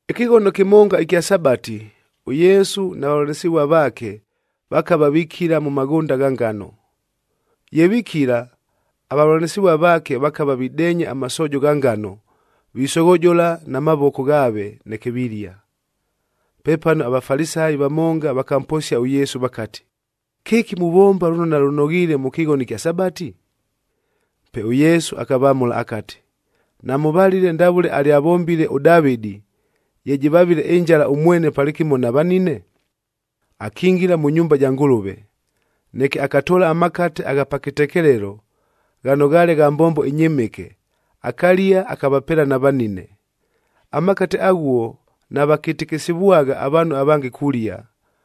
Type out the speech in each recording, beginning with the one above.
Ɨkɨghono kɨmonga ɨkya Sabati, ʉYesu na vavʉlanɨsɨvua vaake, vakava vikila mʉ maghʉnda gha ngano. Ye vikila, avavʉlanɨsɨvua vaake vakava videenya amasoojo gha ngano, visoghojola na mavoko ghaave, neke vilia. Pepano aVafalisayi vamonga vakamposia ʉYesu vakati, “Kɨki muvomba lʉno nalʉnoghiile mʉ kɨghono ɨkya Sabati?” Pe ʉYesu akavamʉla akati, “Namʉvalile ndavʉle alyavombile ʉDavɨdi, ye jɨvavile ɨnjala ʉmwene palɨkɨmo na vanine? Akingila mʉ nyumba ja Ngʉlʉve, neke akatoola amakate agha pa kɨtekelelo, ghano ghaale gha mbombo ɨnyɨmɨke, akalia akavapeela na vanine. Amakate aghuo navakɨtɨkɨsɨvwagha avaanhu avange kulia,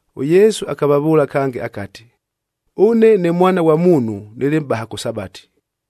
ɄYesu akavavʉʉla kange akati, “Ʉne ne Mwana ghwa Muunhu nɨlɨ Mʼbaha kʉ Sabati.”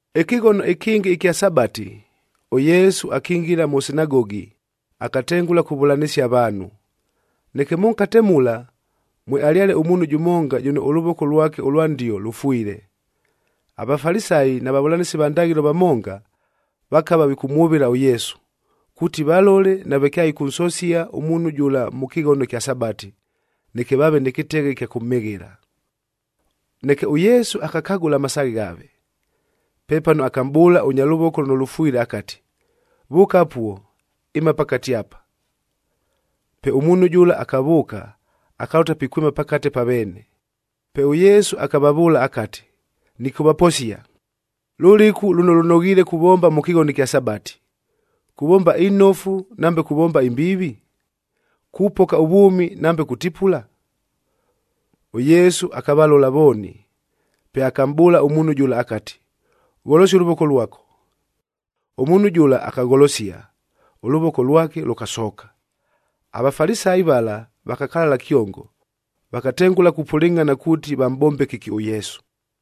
Ɨkɨghono ɨkɨngɨ ɨkya Sabati, ʉYesu akingila mʉ sinagogi, akatengʉla kuvʉlanɨsia avaanhu. Neke mʉnkate mula, mwealyale ʉmuunhu jʉmonga jʉno ʉlʉvoko lwake ʉlwa ndio lʉfwile. AVafalisayi na vavʉlanɨsi va ndaghɨlo vamonga, vakava vikʉmwʉvɨla ʉYesu, kuuti valole nave kyaɨkʉnsosia ʉmuunhu jʉla mʉ kɨghono ɨkya Sabati, neke vaave nɨ kɨteghe ɨkya kʉmhɨghɨla. Neke ʉYesu akakagʉla amasaaghe ghaave. Pepano akamʼbʉʉla ʉnya lʉvoko lʉno lʉfwile akati, “Vʉʉka apuo, ɨma pakate apa.” Pe ʉmuunhu jʉla akavʉʉka, akalʉta pikwɨma pakate pa veene. Pe ʉYesu akavavʉʉla akati, “Nɨkʉvaposia, lʉlɨku lʉno lʉnoghiile kuvomba mʉ kɨghono ɨkya Sabati! Kuvomba inofu nambe kuvomba imbiivi? Kupoka ʉvwʉmi nambe kutipula?” ɄYesu akavalola vooni, pe akamʼbʉʉla ʉmuunhu jʉla akati, “Gholosia ʉlʉvoko lwako.” Ʉmuunhu jʉla akagholosia, ʉlʉvoko lwake lʉkasooka. AVafalisayi vala vakakalala kyongo. Vakatengʉla kupʉlɨngʼhana kuuti, vamʼbombe kɨki ʉYesu.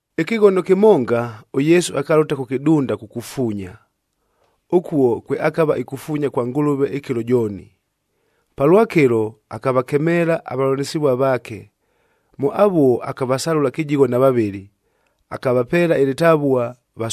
Ɨkɨghono kɨmonga, ʉYesu akalʉta kʉ kɨdunda kukufuunya, ʉkuo kwe akava ikufuunya kwa Ngʉlʉve ɨkɨlo jooni. Palwakɨlo, akavakemeela avavʉlanɨsɨvua vaake. Mʉ avuo akavasalʉla kɨjigho na vavɨlɨ, akavapeela ɨlɨtavua,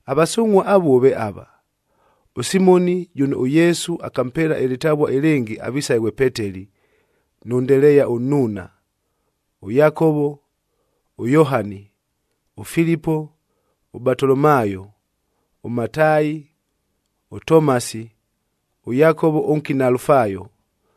Avasungʼhua avuo ve ava: ʉSimoni jʉno ʉYesu akampeela ɨlɨtavua ɨlɨngɨ avisaghe ghwe Peteli nʉ Ndeleeya ʉnnuuna, ʉYakovo, ʉYohani, ʉFilipo, ʉBatolomaayo, ʉMataayi, ʉTomasi, ʉYakovo ʉnkina Alufaayo,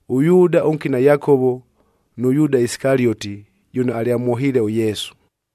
ʉYuuda ʉnkina Yakovo nʉ Yuuda Isikalioti, jʉno alyamwohiile ʉYesu.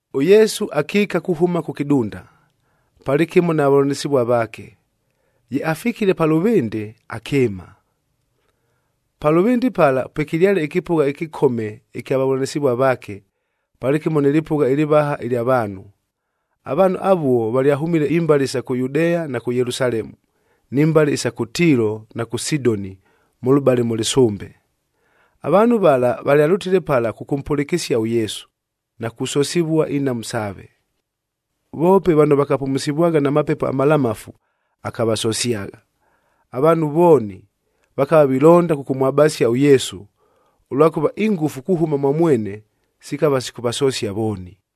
ɄYesu akiika kuhʉma kʉ kɨdunda, palɨkɨmo na vavʉlanɨsɨvua vaake. Ye afikile pa lʉvɨndɨ, akɨɨma. Pa lʉvɨndɨ pala pwekɨlyale ɨkɨpʉgha ɨkɨkome ɨkya vavʉlanɨsɨvua vaake,d palɨkɨmo nɨ lɨpʉgha ɨlɨvaha ɨlya vaanhu. Avaanhu avuo valyahʉmile imbale isa kʉ Yudea na kʉ Yelusalemu, ni mbale isa kʉ Tiilo na kʉ Sidoni mʉlʉbale mʉ lɨsʉmbe. Avaanhu vala valyalʉtile pala kʉkʉmpʉlɨkɨsia ʉYesu, na kusosivua inhamu saave. Voope vano vakapumusivwagha na mapepo amalamafu, akavasosyagha. Avaanhu vooni, vakava vilonda kʉkʉmwabasia ʉYesu, ʉlwakʉva ingʉfu kuhʉma mwa mwene sikava sikʉvasosia vooni.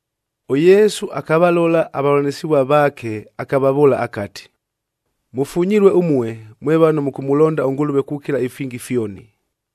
ɄYesu akavalola avavʉlanɨsɨvua vaake, akavavʉʉla akati, “Mʉfunyilue ʉmue, mwe vano mʉkʉmʉlonda ʉNgʉlʉve kukila ifingi fyoni,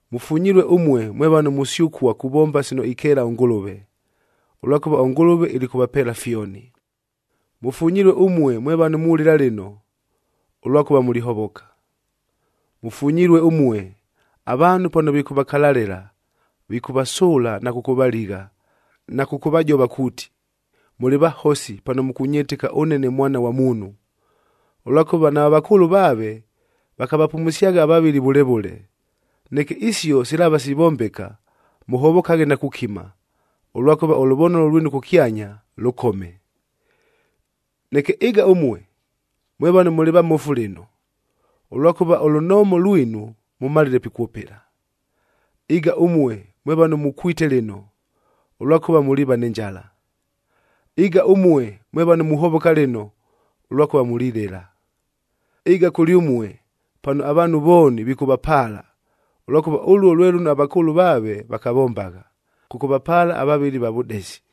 Mʉfunyilue ʉmue, mwe vano musyʉkua kuvomba sino ikeela ʉNgʉlʉve, ʉlwakʉva ʉNgʉlʉve ilikʉvapeela fyoni.f Mʉfunyilue ʉmue, mwe vano mulɨla lɨno, ʉlwakʉva mulihovoka. “Mʉfunyilue ʉmue, avaanhu pano vikʉvakalalɨla, vikʉvasʉʉla na kʉkʉvaligha, na kʉkʉvajova kuuti, mʉlɨ vahosi pano mʉkʉnyɨtɨka ʉne ne Mwana ghwa Muunhu. Ʉlwakʉva nava vakʉʉlʉ vaave, vakavapumusyagha avavɨli vʉle vʉle. Neke isio silaava sivombeka, mʉhovokaghe na kukima, ʉlwakʉva ʉlʉvonolo lwinu kʉkyanya, lʉkome. Neke ɨga ʉmue, mwe vano mʉlɨ vamofu lɨno, ʉlwakʉva ʉlunoomo lwinu, mʉmalile pikwʉpɨla. Ɨga ʉmue, mwe vano mukwite lɨno, ʉlwakʉva muliiva nɨ njala. Ɨga ʉmue, mwe vano muhovoka lɨno, ʉlwakʉva mulilɨla. Ɨga kʉlyʉmue, pano avaanhu vooni vikʉvapaala, ʉlwakʉva ʉluo lwe lʉno avakʉʉlʉ vaave vakavombagha, kʉkʉvapaala avavɨli va vʉdesi.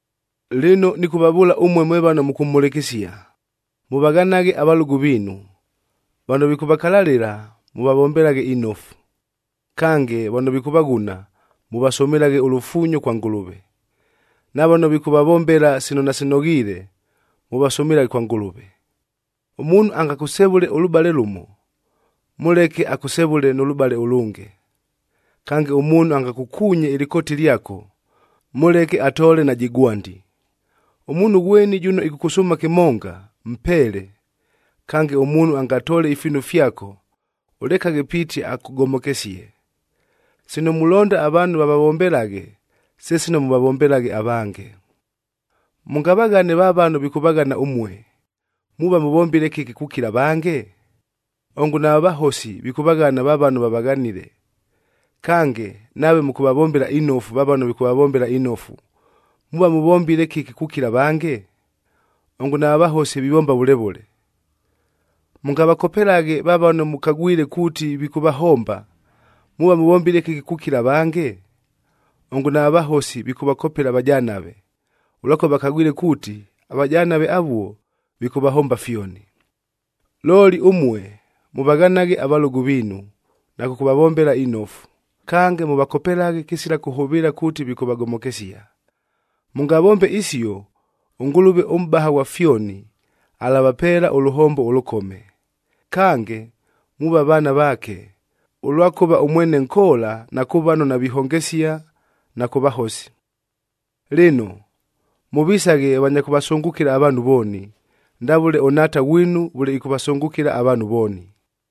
“Lɨno, nɨkʉvavʉʉla ʉmue mwe vano mʉkʉmhʉlɨkɨsia, mʉvaghanaghe avalʉgʉ viinu. Vano vikʉvakalalɨla, mʉvavombelaghe inofu. Kange, vano vikʉvaghuna, mʉvasʉmɨlaghe ʉlufuunyo kwa Ngʉlʉve. Na vano vikʉvavombela sino nasinoghiile, mʉvasʉmɨlaghe kwa Ngʉlʉve. Ʉmuunhu angakʉsevʉle ʉlʉbale lʉmo, mʉleke akʉsevʉle nʉ lʉbale ʉlʉnge. Kange, ʉmuunhu angakʉkuunye ɨlɨkooti lyako, mʉleke atoole najɨ gwandi. Ʉmuunhu ghweni jʉno ɨkʉkʉsʉʉma kɨmonga, mpeele. Kange, ʉmuunhu angatoole ifiinu fyako, ʉlekaghe piiti akʉgomokesie. Sino mulonda avaanhu vavavombelaghe, se sino mʉvavombelaghe avange. “Mʉngavaghane va vano vikʉvaghana ʉmue, muuva mʉvombile kɨki kukila avange? Ongo nava vahosi, vikʉvaghana va vano vavaghanile! Kange, nave mʉkʉvavombela inofu va vano vikʉvavombela inofu, muuva mʉvombile kɨki kukila avange? Ongo nava vahosi vivomba vʉle vʉle! Mʉngavakopelaghe va vano mʉkagwile kuuti vikʉvahomba, muuva mʉvombile kɨki kukila avange? Ongo nava vahosi, vikʉvakopela avajanave, ʉlwakʉva vakagwile kuuti, avajanave avuo vikʉvahomba fyoni! “Looli ʉmue, mʉvaghanaghe avalʉgʉ viinu na kʉkʉvavombela inofu. Kange, mʉvakopelaghe kɨsila kʉhʉvɨɨla kuuti vikʉvagomokesia. Mʉngavombe isio, ʉNgʉlʉve ʉMʼbaha ghwa fyoni alavapeela ʉlʉhombo ʉlʉkome. Kange, muuva vaana vaake, ʉlwakʉva ʉmwene nkoola na kʉ vano navihongesia na kʉ vahosi. Lɨno, mʉvisaghe vanya kʉvasʉngʉkɨla avaanhu vooni, ndavʉle ʉNhaata ghwinu vʉle ɨkʉvasʉngʉkɨla avaanhu vooni.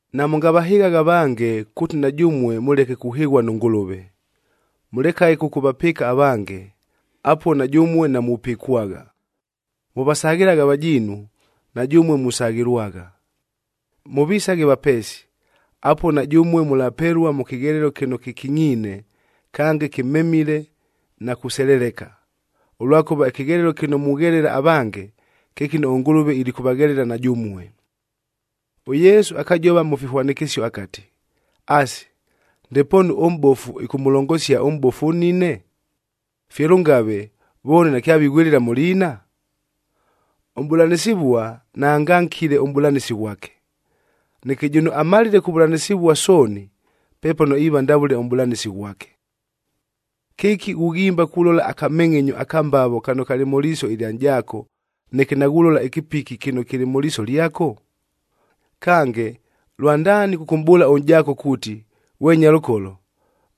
“Namʉngavahɨghaghe avange kuuti na jʉmue mʉleke kuhɨghua nʉ Ngʉlʉve. Mʉlekaghe kʉkʉvapɨɨka avange, apuo na jʉmue namupɨkwagha. Mʉvasaghɨlaghe avajiinu, na jʉmue musaghɨlwagha. Mʉvisaghe vapeesi, apuo na jʉmue mʉlapelua mʉ kɨghelelo kɨno kɨkingʼiine, kange kɨmemile na kuseleleka. Ʉlwakʉva, ɨkɨghelelo kɨno mughelela avange, kye kɨno ʉNgʉlʉve ilikʉvaghelela na jʉmue.” ɄYesu akajova mʉ fihwanɨkɨsio akati, “Asi, ndepoonu ʉmʼbofu ɨkʉmʉlongosia ʉmʼbofu ʉnnine? Fye lʉngave, vooni nakyavighwɨlɨla mʉ liina? Ʉmʼbʉlanɨsɨvua, naangankile ʉmʼbʉlanɨsi ghwake. Neke, jʉno amalile kuvʉlanɨsɨvua sooni, pepano iiva ndavʉle ʉmʼbʉlanɨsi ghwake. “Kɨki ghughimba kulola akamengʼenyo aka mbavo kano kalɨ mʉ liiso ɨlya nʼjaako, neke naghulola ɨkɨpiki kɨno kɨlɨ mʉ liiso lyako? Kange, lwandaani kʉkʉmʼbʉʉla ʉnʼjaako kuuti, ‘Ghwe nyalʉkolo,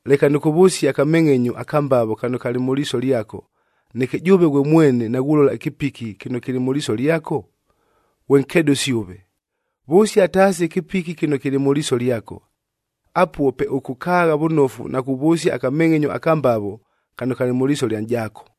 leka nɨkʉvʉsie akamengʼenyo aka mbavo kano kalɨ mʉ liiso lyako,’ neke jʉʉve ghwe mwene naghulola ɨkɨpiki kɨno kɨlɨ mʉ liiso lyako? Ghwe nkedʉsi ʉve! Vʉsia taasi ɨkɨpiki kɨno kɨlɨ mʉ liiso lyako. Apuo pe ʉkʉkaagha vʉnofu na kuvʉsia akamengʼenyo aka mbavo kano kalɨ mʉ liiso lya nʼjaako.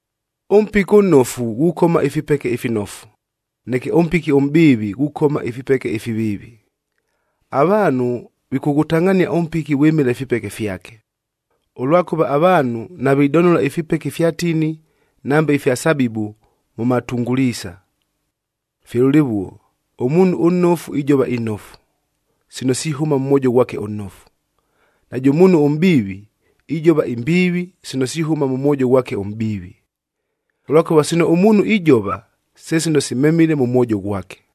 “Ʉmpiki ʉnnofu ghukoma ifipeke ifinofu, neke ʉmpiki ʉmʼbiivi ghukoma ifipeke ifiviivi. Avaanhu vikʉghʉtangʼhania ʉmpiki vwɨmɨla ifipeke fyake, ʉlwakʉva avaanhu navidonola ifipeke ifya tini nambe ifya sabibu mʉ matunguliisa. Fye lʉlɨvuo, ʉmuunhu ʉnnofu ijova inofu, sino sihʉma mʉ mwojo ghwake ʉnnofu. Najʉ muunhu ʉmʼbiivi ijova imbiivi, sino sihʉma mʉ mwojo ghwake ʉmʼbiivi. Ʉlwakʉva, sino ʉmuunhu ijova, se sino simemile mʉ mwojo ghwake.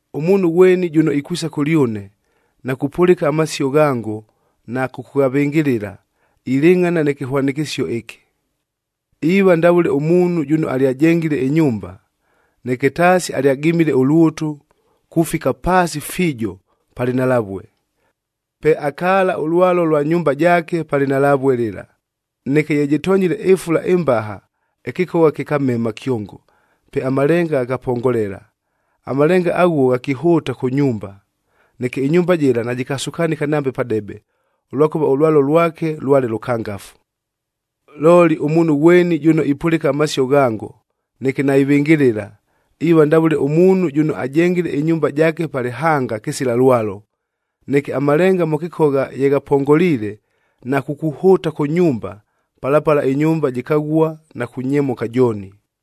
Ʉmuunhu ghweni jʉno ikwisa kʉlyʉne, na kupʉlɨka amasio ghango na kʉkʉghavɨngɨlɨla, ilɨngʼhana nɨ kɨhwanɨkɨsio ɨkɨ: Iiva ndavʉle ʉmuunhu jʉno alyajengile ɨnyumba, neke taasi alyagimile ʉlwʉtʉ kufika paasi fiijo pa lɨnhalavue. Pe akaala ʉlwalo lwa nyumba jaake pa lɨnhalavue lɨla. Neke ye jɨtonyile ɨfula ɨmbaha, ɨkɨkogha kɨkamema kyongo, pe amalenga ghakapongolela. Amalenga aghuo ghakihʉʉta kʉ nyumba, neke ɨnyumba jɨla najɨkasukanɨka nambe padebe, ʉlwakʉva ʉlwalo lwake lwale lʉkangafu. “Looli, ʉmuunhu ghweni jʉno ipʉlɨka amasio ghango, neke naivɨngɨlɨla, iiva ndavʉle ʉmuunhu jʉno ajengile ɨnyumba jaake pa lɨhanga kɨsila lwalo. Neke amalenga mʉ kɨkogha ye ghapongoliile na kukuhʉʉta kʉ nyumba, pala pala ɨnyumba jɨkaghua na kunyemʉka jooni.”